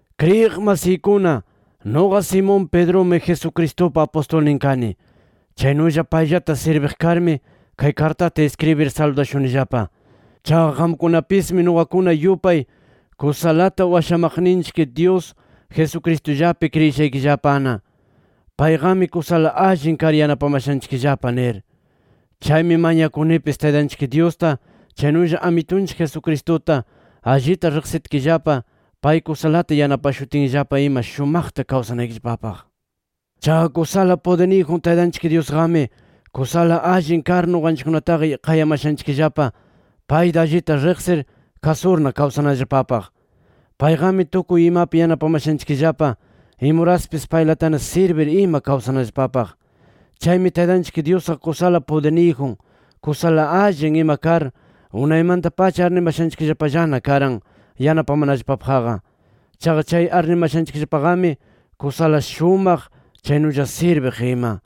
Kriyiq masiykuna, nuqa Simón Pedrumi Jesucristupa apustulnin kani. Chaynulla payllata sirbiq karmi, kay kartata iskribir saludashunillapa. Chaqa qamkunapismi nuqakuna yupay kusalata washamaqninchik Dyus Jesucristullapi kriyishaykillapana: Payqami kusala allin kar yanapamashanchikllapa nir. Chaymi mañakunipis, Taytanchik Dyusta, chaynulla Amitunchik Jesucristuta allita riqsitkillapa, pay kusalata yanapashutinllapa ima shumaqta kawsanaykillapapaq. Chaqa kusala pudirniyjun Taytanchik Dyusqami, kusala allin kar nuqanchikkunataqa qayamashanchikllapa payta allita riqsir kasurna kawsanallapapaq. Payqami tukuy imapi yanapamashanchikllapa, imuraspis paylatana sirbir ima kawsanallapapaq. Chaymi Taytanchik Dyusqa kusala pudirniyjun, kusala allin ima kar unaymanta-pacha arnimashanchikllapallana karan yanapamanallapapaqqa. Chaqa chay arnimashanchikllapaqami kusala shumaq, chaynulla sirbiq ima.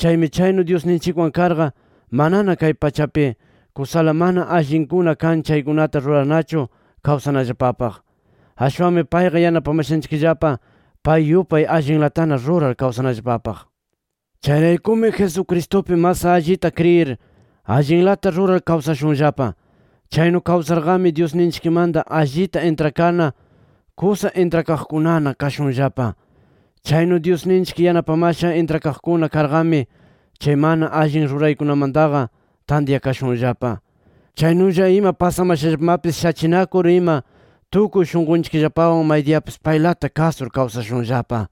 Chaymi chaynu Dyusninchikwan karqa, manana kay pachapi kusala mana allinkuna kan chaykunata rurarnachu kawsanallapapaq. Ashwanmi payqa yanapamashanchikllapa pay yupay allinlatana rurar kawsanallapapaq. Chayraykumi Jesucristupi mas allita kriyir, allinlata rurar kawsashunllapa. Chaynu kawsarqami, Dyusninchikmanta allita intrakarna, kusa intrakaqkunana kashunllapa. Chaynu Dyusninchik yanapamasha intrakaqkuna karqami, chay mana allin ruraykunamantaqa tantyakashunllapa. Chaynulla ima pasamashallapamapis shachinakur ima tukuy shunqunchikllapawan maydiyapis paylata kasur kawsashunllapa.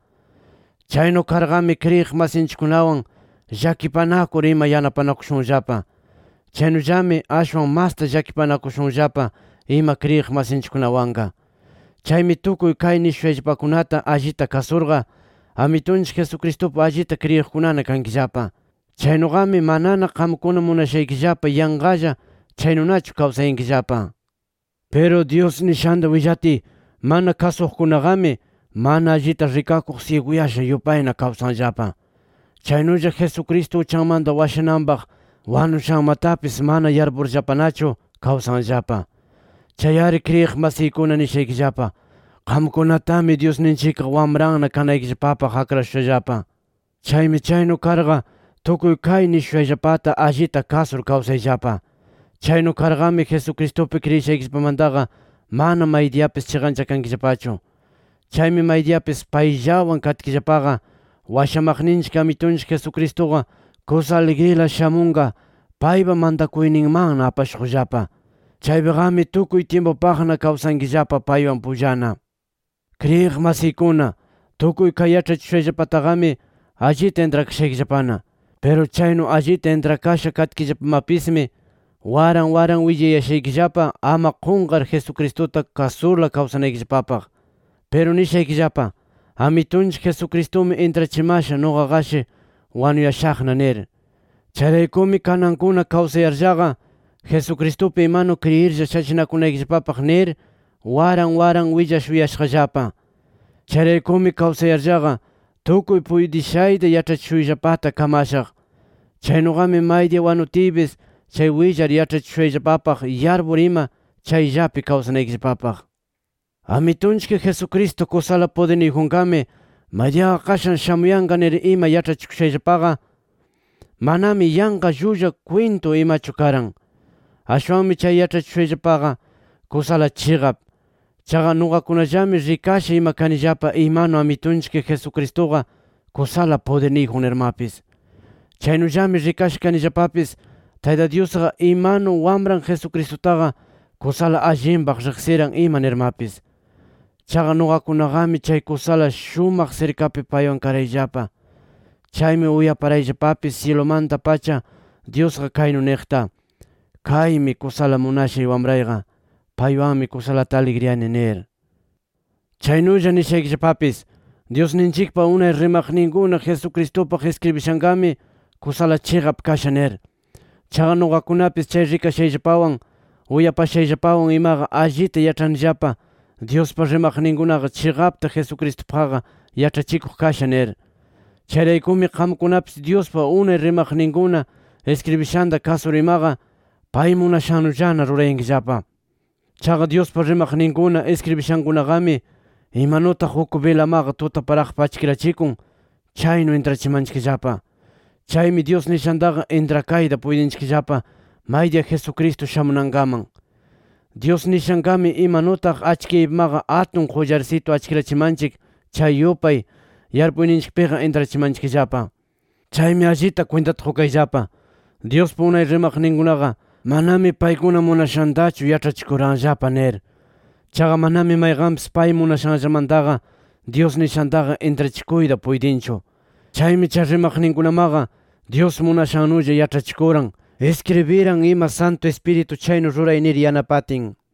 Chaynu karqami kriyiq masinchikkunawan llakipanakur ima yanapanakushunllapa. Chaynullami ashwan masta llakipanakushunllapa ima kriyiq masinchikkunawanqa. Chaymi tukuy kay nishushayllapakunata allita kasurqa, Amitunchik Jesucristupi allita kriyiqkunana kankillapa. Chaynuqami manana qamkuna munashaykillapa yanqalla chaynunachu kawsayankillapa. Piru Dyus nishanta willatiy mana kasuqkunaqami, mana allita rikakuq syiguyasha yupayna kawsanllapa. Chaynulla Jesucristo uchanmanta washananpaq wanushanmatapis manana yarpurllapanachu kawsanllapa. Chay-ari kriyiq masiykuna nishaykillapa: Qamkunatami Dyusninchikqa wamranna kanaykillapapaq akrashushallapa. Chaymi chaynu karqa tukuy kay nishushayllapata allita kasur kawsayllapa. Chaynu karqami, Jesucristupi kriyishaykillapamantaqa mana maydiyapis chiqanchakankillapachu. Chaymi maydiyapis payllawan katkillapaqa, washamaqninchik Amitunchik Jesucristuqa kusa aligrila shamunqa paypa mantakuyninmanna apashuqllapa. Chaypiqami tukuy tyimpupaqna kawsankillapa paywan pullana. Kriyiq masiykuna, tukuy kay yaĉhachishushayllapataqami, allita intrakashaykillapana. Piru chaynu allita intrakasha katkillapamapismi waran waran willayashaykillapa, ama qunqar Jesucristuta kasurla kawsanaykillapapaq. Piru nishaykillapa: Amitunchik Jesucristumi intrachimasha, nuqaqashi wanuyashaqna nir. Chayraykumi kanankuna kawsayarllaqa, Jesucristupi imanu kriyirlla shachinakunaykillapapaq nir waran waran willashuyashaqllapa. Chayraykumi kawsayarllaqa tukuy puytishayta yaĉhachishuyllapata kamashaq. Chaynuqami maydiya wanutiypis chay willar yaĉhachishushayllapapaq yarpur ima, chayllapi kawsanaykillapapaq. Amitunchik Jesucristo kusala pudirniyjunqami, maydiyaqa qashan shamuyanqa nir ima yaĉhachikushayllapaqa, manami yanqa llulla kwintu imachu karan. Ashwanmi chay yaĉhachishushayllapaqa kusala chiqap. Chaqa nuqakunallami rikasha ima kanillapa imanu Amitunchik Jesucristuqa kusala pudirniyjun nirmapis. Chaynullami rikasha kanillapapis Tayta Dyusqa imanu Wamran Jesucristutaqa kusala allinpaq riqsiran ima nirmapis. Chaqa nuqakunaqami chay kusala shumaq sirkapi paywan karayllapa. Chaymi uyaparayllapapis syilumanta-pacha Dyusqa kaynu niqta: “Kaymi kusa munashay Wamrayqa. Paywanmi kusalata aligriyani” nir. Chaynulla nishaykillapapis: Dyusninchikpa unay rimaqninkuna Jesucristupaq iskribishanqami kusala chiqap kasha nir. Chaqa nuqakunapis chay rikashayllapawan, uyapashayllapawan imaqa allita yaĉhanillapa Dyuspa rimaqninkunaqa chiqapta Jesucristupaqqa yaĉhachikuq kasha nir. Chayraykumi qamkunapis Dyuspa unay rimaqninkuna iskribishanta kasur imaqa, pay munashannullana rurayankillapa. Chaqa Dyuspa rimaqninkuna iskribishankunaqami imanutaq uk bilamaqa tutaparaqpi achkirachikun, chaynu intrachimanchikllapa. Chaymi Dyus nishantaqa intrakayta puytinchikllapa maydiya Jesucristo shamunankaman. Dyus nishanqami, imanutaq achkiyaypimaqa atun qullarsitu achkirachimanchik chay yupay yarpuyninchikpiqa intrachimanchikllapa. Chaymi allita kwintata qukayllapa: Dyuspa unay rimaqninkunaqa, manami paykuna munashantachu yaĉhachikuranllapa nir. Chaqa manami mayqanpis pay munashanllamantaqa Dyus nishantaqa intrachikuyta puytinchu. Chaymi chay rimaqninkunamaqa Dyus munashannulla yaĉhachikuran, iskribiran ima Santu Ispiritu chaynu ruray nir yanapatin.